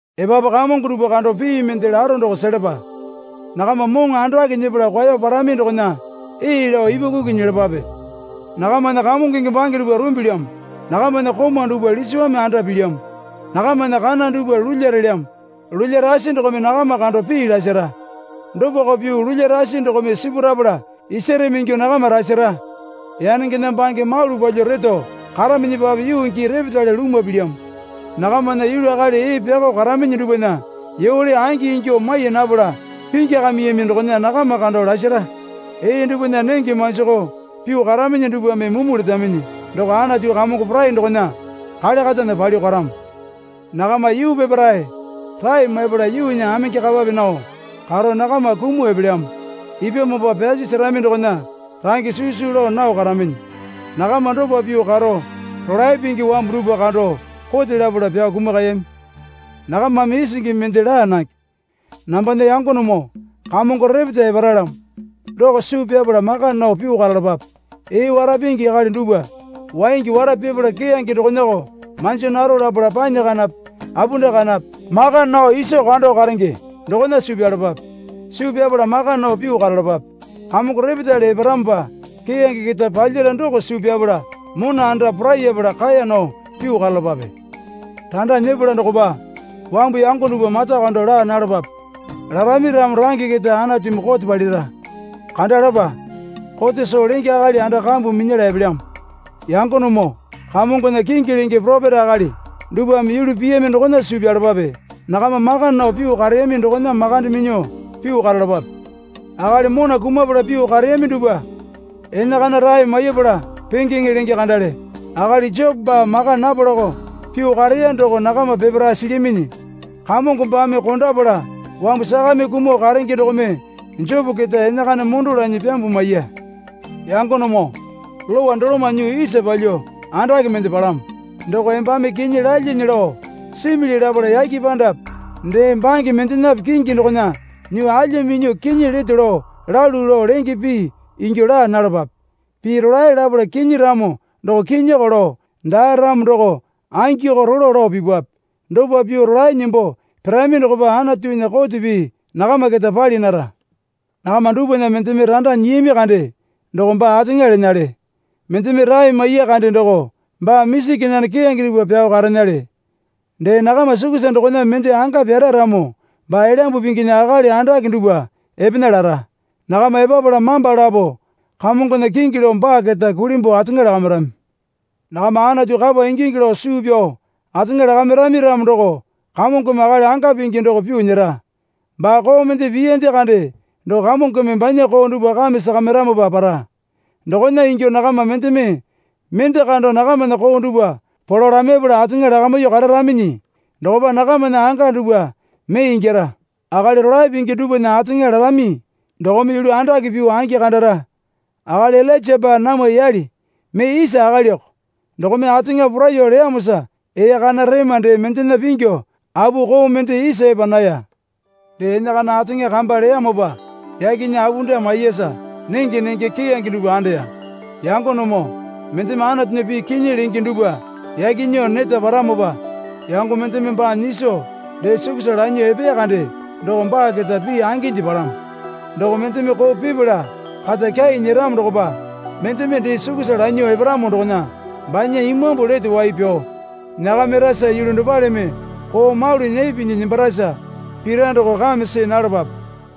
Epapu kamongo dupwa kando pii mende laro doko selapa. Nakama moŋo andake nyepala kwao parami dokona ee lao ipwakuku nyelapape. Nakamana kamongonge bange dupwa rumbilyamo. Nakamana komau dupwa lisiwame anda pilyamo. Nakamana kana dupwa lulya relyamo. Lulya rasi dokome nakama kando pii lasara. Dopako pyuo lulya rasi dokome sipurapala isareme ingyuo nakama rasara. Yanengena bange malu palyuo reto karaminyipape yuu gii repetale lumwa pilyamo. Nakamana yulu akali ee pyakao karaminyi dupwana yole angi ingyuo mai napala pingyakamiyami dokona nakama kando lasara. Ee dupwana nenge manjakao pyuo karaminyi dupwame mumu letaminyi doko Anatu Kamongo Porai dokona kale katana palyuo karamo. Nakama yuu peparae rae maipala yuunya amenge kapape nao karo nakama kumuo epelyamo. Ipyamopa pyasi serami dokona range susu lao nao karaminyi. Nakama dopa pyuo karo rolae pingi wambu dupwa kando kote lapala pyao kumakayami. Nakamame isingi mende laa nange. Nambana yangonemoo Kamongo repeta eparalyamo doko suu pyapala maka nao pyuo karalapape. Ee wara pingi akali dupwa waingi wara pipala keyange dokonako manjo naro lapala panyi kanape apunda kanape maka nao iso kando karenge dokona suu pyalapape. Suu pyapala maka nao pyuo karalapape. Kamongo repetale eparamopa keyange keta palyara doko suu pyapala mona anda porayapala kaeya nao pyuo karalapape. Randa nyepala dokopa wambu yango dupwa mata kando laa nalapape. Larami ramo range keta Anatumi kote palira. Kandalapa. Kote Soo Lenge akali anda kambu minyala epelyamo. Yangonemoo Kamongona kingi lenge poropeta akali dupwame yulu piyami dokona suu pyalapape. Nakama maka nao pyuo kareyami dokona makande minyuo pyuo karalapape. Akali mona kumapala pyuo kareyami dupwa enakana rae maipala pengeŋe lenge kandale. Akali Jopo baa maka napalako pyuo kareya doko nakama peparae silyaminyi. Kamongo baame kondapala wambu sakame kumuo karenge dokome Jopo keta enakana mondo lanyi pyambuo maiya. Yangonemoo lowa doloma nyuo isa palyuo andake mende palamo. Doko embame kinyi lalyane lao simili lapala yake pandape dee bange mendenape kingi dokona nyuo alya minyuo kinyi leto lao lalu lao lenge pii ingyuo laa nalapape. Pii rolae lapala kinyi ramo doko kinyiko lao daa ramo doko angiko rolo lao pipwape. Dopa pyuo rolae nembo pirami dokopa Anatunya kote pii nakama keta pali nara. Nakama dupwana mendeme randa nyiyami kande doko baa ateŋa lenale. Mendeme rae maiya kande doko baa misi kenane keyange dupwa pyao karenale. Dee nakama sukusa dokona mende anga pyara ramo baa Elyambu Pinginya akali andake dupwa epena lara. Nakama epapala mamba lapo Kamongona kingi lao baa keta kulimbuo ateŋa lakamirami. Nakama Anatu kapa ingingi lao suu pyao ateŋa lakamirami ramo doko Kamongome akali anga pingi doko pyuo nyera. Baa koo mende piyande kande doko Kamongome banya koo dupwa kame sakamiramopa para. Dokona ingyuo nakama mendeme mende kando nakamana koo dupwa polo lamaipala ateŋa lakamyuo kararaminyi dokopa nakamana anga dupwa mee ingyara. Akali rolae pingi dupwana ateŋa larami dokome yulu andake pyuo angi kandara. Akali Ilainja baa namwa yale mee isa akaliko dokome ateŋa poraiyuo leyamosa ee kana rema dee mendena pingyu apu koo mende isa epa naya. Dee enakana ateŋa kamba leyamopa yakena apunda maiyasa nenge nenge keyange dupwa andeya. Yangonemoo mendeme Anatunya pii kinyi lenge dupwa yake nyuo neta paramopa yango mendeme baa nyiso dee sukusa lanyuo epeya kande doko baa keta pii anginde palamo. Doko mendeme koo pipala kata kyai nyeramo dokopa mendeme dee sukusa lanyuo eparamo dokona banya imambu lete wai pyao nyakamirasa yulu dopaleme koo malu nee pinyi nembarasa pira doko kame see nalapape.